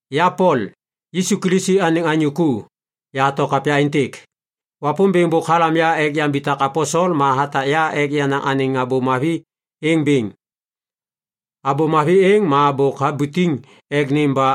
Ya Pol, Yisu Kilisi anêŋ anyô ku, yahato kapya êntêk. Wapômbêŋ bôk halam ya ek yambitak aposel ma hatak ya ek yanaŋ anêŋ Abô Mavi êŋ bêŋ. Abô Mavi êŋ ma bôk habutiŋ ek nêm ba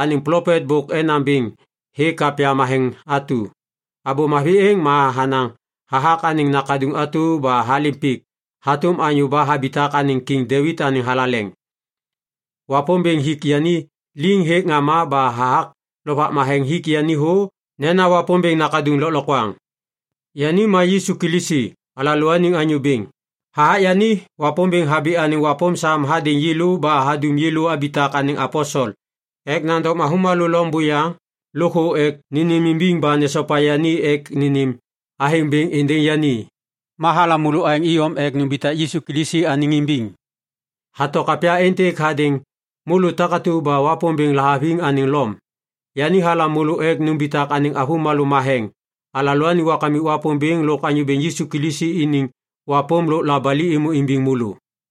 anêŋ plopet bôk enaŋ bêŋ hêk kapya matheŋ atu. Abô Mavi êŋ ma hanaŋ hathak anêŋ Nakaduŋ atu ba halêm pik hatôm anyô ba habitak anêŋ Kiŋ Devit anêŋ thalaleŋ. Wapômbêŋ hik yani liŋ hêk ŋama ba hathak Lovak Matheŋ hik yani thô nena Wapômbêŋ Nakaduŋ Lôklokwaŋ. Yani ma Yisu Kilisi, alalôaniŋ Anyô Bêŋ. Hathak yani, Wapômbêŋ habi anêŋ wapôm sam hadêŋ yêlô ba hadum yêlô abitak anêŋ aposel ek nandom avômalô loŋ buyaŋ lôkthô ek nênêmimbiŋ ba nesopa yani ek nênêm athêŋ bêŋ êndêŋ yani. Ma halam môlô aêŋ iyom ek numbitak Yisu Kilisi anêŋ imbiŋ. Yahato kapya êntêk hadêŋ môlô takatu ba Wapômbêŋ lahaviŋ anêŋ Lom. Yani halam môlô ek numbitak anêŋ avômalô matheŋ. Alalôaniŋ Kamik Wapômbêŋ lôk Anyô Bêŋ Yisu Kilisi iniŋ wapôm lôk labali êmô imbiŋ môlô.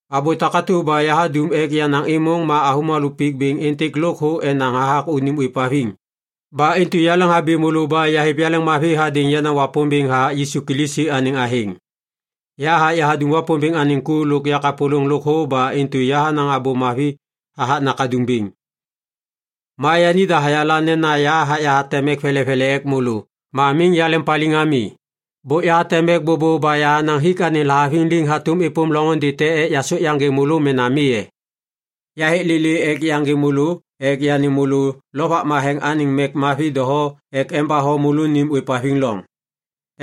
Abô takatu ba yahadum ek yanaŋ êmôŋ ma avômalô pik bêŋ êntêk lôkthô enaŋ hathak unim ôêvhaviŋ. Ba intu yaleŋhabi môlô ba yahêv yaleŋmavi hadêŋ yenaŋ Wapômbêŋ hathak Yisu Kilisi anêŋ athêŋ. Yahathak yahadum Wapômbêŋ anêŋ ku lôk yakapôlôŋ lôkthô ba intu yahanaŋ Abô Mavi hathak Nakaduŋ bêŋ. Ma yanida hayala nena yahathak yahateŋ mek velevele ek môlô ma miŋ yaleŋpaliŋ ami. Bôk yahateŋ mek bôbô ba yahanaŋ hik anêŋ lahaviŋ liŋ hatôm êpôm loŋôndê te ek yasôk yaŋgê môlô mena mi e? Yahêk lêlê ek yaŋgê môlô ek yanêm môlô Lovak Matheŋ anêŋ mek mavi doho ek embatho môlônim ôêvhaviŋ loŋ.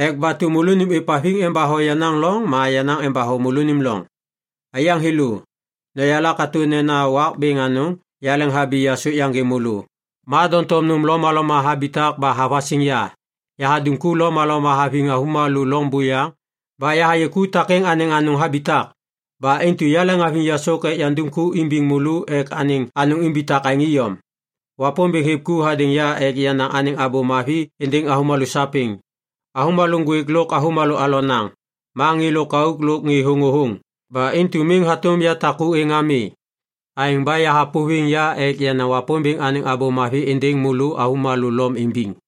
Ek batu môlônim ôêvhaviŋ embatho yenaŋ loŋ ma yenaŋ embatho môlônim loŋ. Aiyaŋ thêlô, noyala katô nena wak bêŋ anôŋ yaleŋhabi yasôk yaŋgê môlô, ma doŋtom nôm lomaloma habitak ba havasiŋ ya. Yahadum ku lomaloma haviŋ avômalô loŋ buyaŋ ba yahayê ku takêŋ anêŋ anôŋ habitak. Ba intu yaleŋhaviŋ yasôk ek yandum ku imbiŋ môlô ek anêŋ anôŋ imbitak aêŋ iyom. Wapômbêŋ hêv ku hadêŋ ya ek yanaŋ anêŋ Abô Mavi êndêŋ avômalô sapêŋ, avômalô ŋgwêk lôk avômalô alonaŋ, ma ŋê lôkauk lôk ŋê thôŋôthôŋ. Ba intu miŋ hatôm yatak ku êŋ ami. Aêŋ ba yahapôviŋ ya ek yanaŋ Wapômbêŋ anêŋ Abô Mavi êndêŋ môlô avômalô Lom imbiŋ.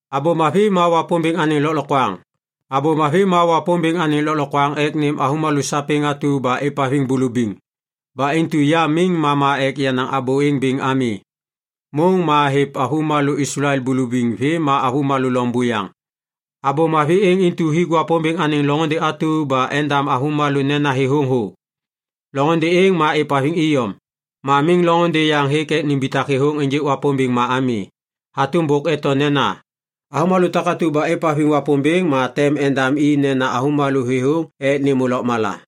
Abô Mavi ma Wapômbêŋ anêŋ lôklokwaŋ ek nêm avômalô sapêŋ atu ba êvhaviŋ bulubiŋ. Ba intu ya miŋ mama ek yanaŋ abô êŋ bêŋ ami. Môŋ ma hêv avômalô Islael bulubiŋ vêm ma avômalô loŋ buyaŋ. Abô Mavi êŋ intu hik Wapômbêŋ anêŋ loŋôndê atu ba endam avômalô nena thêthôŋ thô. Loŋôndê êŋ ma êvhaviŋ iyom, ma miŋ loŋôndê yaŋ hêk ek nimbitak thêthôŋ ênjêk Wapômbêŋ ma ami. Hatôm bôk eto nena, “Avômalô takatu ba êvhaviŋ Wapômbêŋ, ma tem endam i nena avômalô thêthôŋ ek nêmô lôkmala.”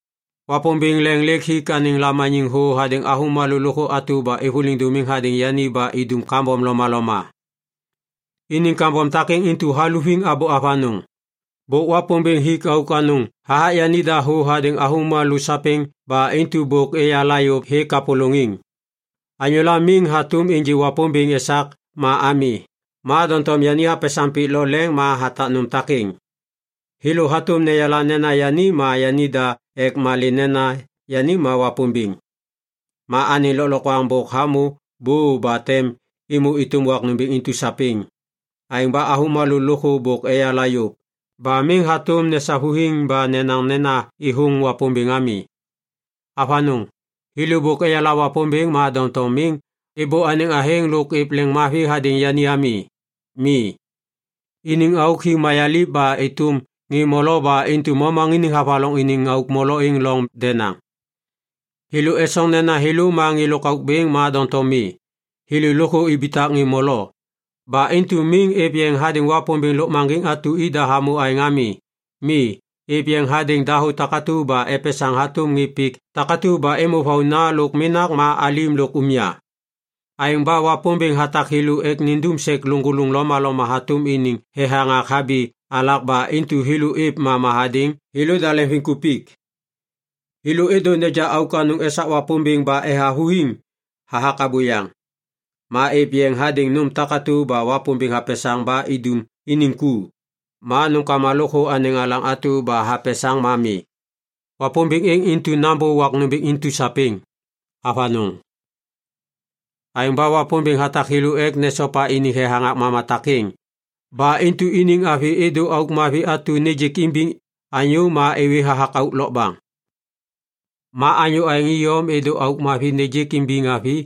Wapômbêŋ leŋ lêk hik anêŋ lamaniŋ thô hadêŋ avômalô lôkthô atu ba êvôliŋ dômiŋ hadêŋ yani ba idum kambom lomaloma. Iniŋ kambom takêŋ intu haluviŋ abô avanôŋ. Bôk Wapômbêŋ hik auk anôŋ hathak yanida thô hadêŋ avômalô sapêŋ ba intu bôk eyala yôv hêk kapôlôŋiŋ. Anyôla miŋ hatôm ênjê Wapômbêŋ esak ma ami. Ma doŋtom yani hapesaŋ pik lo leŋ ma hathak nôm takêŋ, thêlô hatôm neyala nena yani ma yaŋda ek malê nena yani ma Wapômbêŋ. Ma anêŋ lôklokwaŋ bôk hamô bô ba tem êmô êtôm wak nômbêŋ intu sapêŋ. Aêŋ ba avômalô lôkthô bôk eyala yôv, ba miŋ hatôm nesavuthiŋ ba nenaŋ nena êthôŋ Wapômbêŋ ami. Avanôŋ, thêlô bôk eyala Wapômbêŋ ma doŋtom miŋ êbô anêŋ athêŋ lôk êv leŋiŋmavi hadêŋ yani ami. Mi, iniŋ auk hi mayaliv ba êtôm ŋê molo ba intu momaŋiniŋ havaloŋ iniŋ auk molo êŋ loŋ denaŋ. Thêlô esoŋ nena thêlô ma ŋê lôkauk bêŋ ma doŋtom mi, thêlô lôkthô ibitak ŋê molo. Ba intu miŋ êv yeŋ hadêŋ Wapômbêŋ lôkmaŋgiŋ atu ida hamô aêŋ ami. Mi, êv yeŋ hadêŋ dahô takatu ba epesaŋ hatôm ŋê pik takatu ba êmô vauna lôk menak ma alim lôk umya. Aêŋ ba Wapômbêŋ hatak thêlô ek nindum sek lôŋgôlôŋ lomaloma hatôm iniŋ thethaŋak habi alak ba intu thêlô êv mama hadêŋ thêlôda leŋviŋkupik. Thêlô êdô neja auk anôŋ esak Wapômbêŋ ba ethavuthiŋ hathak abôyaŋ. Ma êv yeŋ hadêŋ nôm takatu ba Wapômbêŋ hapesaŋ ba idum iniŋ ku, ma nômkama lôkthô anêŋ alaŋ atu ba hapesaŋ ma mi. Wapômbêŋ êŋ intu nambô wak nômbêŋ intu sapêŋ. Avanôŋ. Aêŋ ba Wapômbêŋ hatak thêlô ek nesopa iniŋ thethaŋak mama takêŋ. Ba intu iniŋ avi êdô auk mavi atu nêjêk imbiŋ anyô ma êwê hathak auk lokbaŋ. Ma anyô aêŋ iyom êdô auk mavi nêjêk imbiŋ avi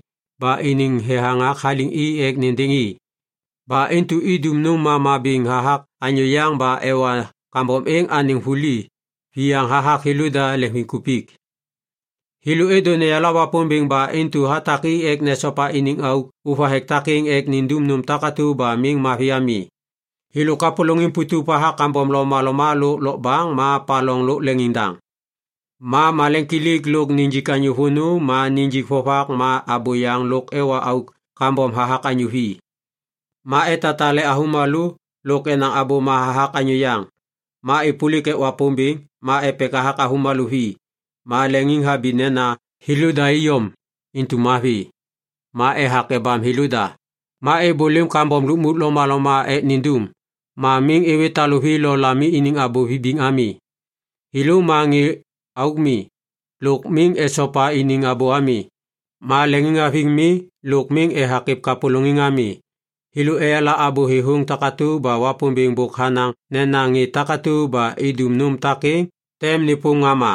ba iniŋ thethaŋak haliŋ i ek nêndêŋ i. Ba intu idum nôm mama bêŋ hathak anyô yaŋ ba ewa kambom êŋ anêŋ vuli viyaŋ hathak thêlôda leŋviŋkupik. Thêlô êdô neyala Wapômbêŋ ba intu hatak i ek nesopa iniŋ auk ôvathek takêŋ ek nindum nôm takatu ba miŋ mavi ami. Thêlô kapôlôŋiŋ putup hathak kambom lomaloma lôk lokbaŋ ma paloŋ lôk leŋiŋdaŋ. Ma maleŋkilik lôk nijik anyô vônô ma nijik vovak ma abôyaŋ lôk ewa auk kambom hathak anyô vi. Ma etatale avômalô lôk enaŋ abôma hathak anyô yaŋ. Ma êpôlik ek Wapômbêŋ, ma epek hathak avômalô vi, ma leŋiŋhabi nena thêlôda iyom intu mavi. Ma ethak ebam thêlôda, ma êbôlêm kambom lukmuk lomaloma ek nindum, ma miŋ êwê taluvi lo lami iniŋ abô vibiŋ ami. Thêlô ma ŋê auk mi, lôk miŋ esopa iniŋ abô ami, ma leŋiŋhaviŋ mi, lôk miŋ ethak êv kapôlôŋiŋ ami. Thêlô eyala abô thêthôŋ takatu ba Wapômbêŋ bôk hanaŋ nena ŋê takatu ba idum nôm takêŋ tem nêpôm ŋama.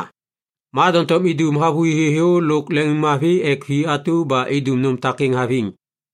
Ma doŋtom idum havôhi thêthô lôk leŋiŋmavi ek vi atu ba idum nôm takêŋ haviŋ.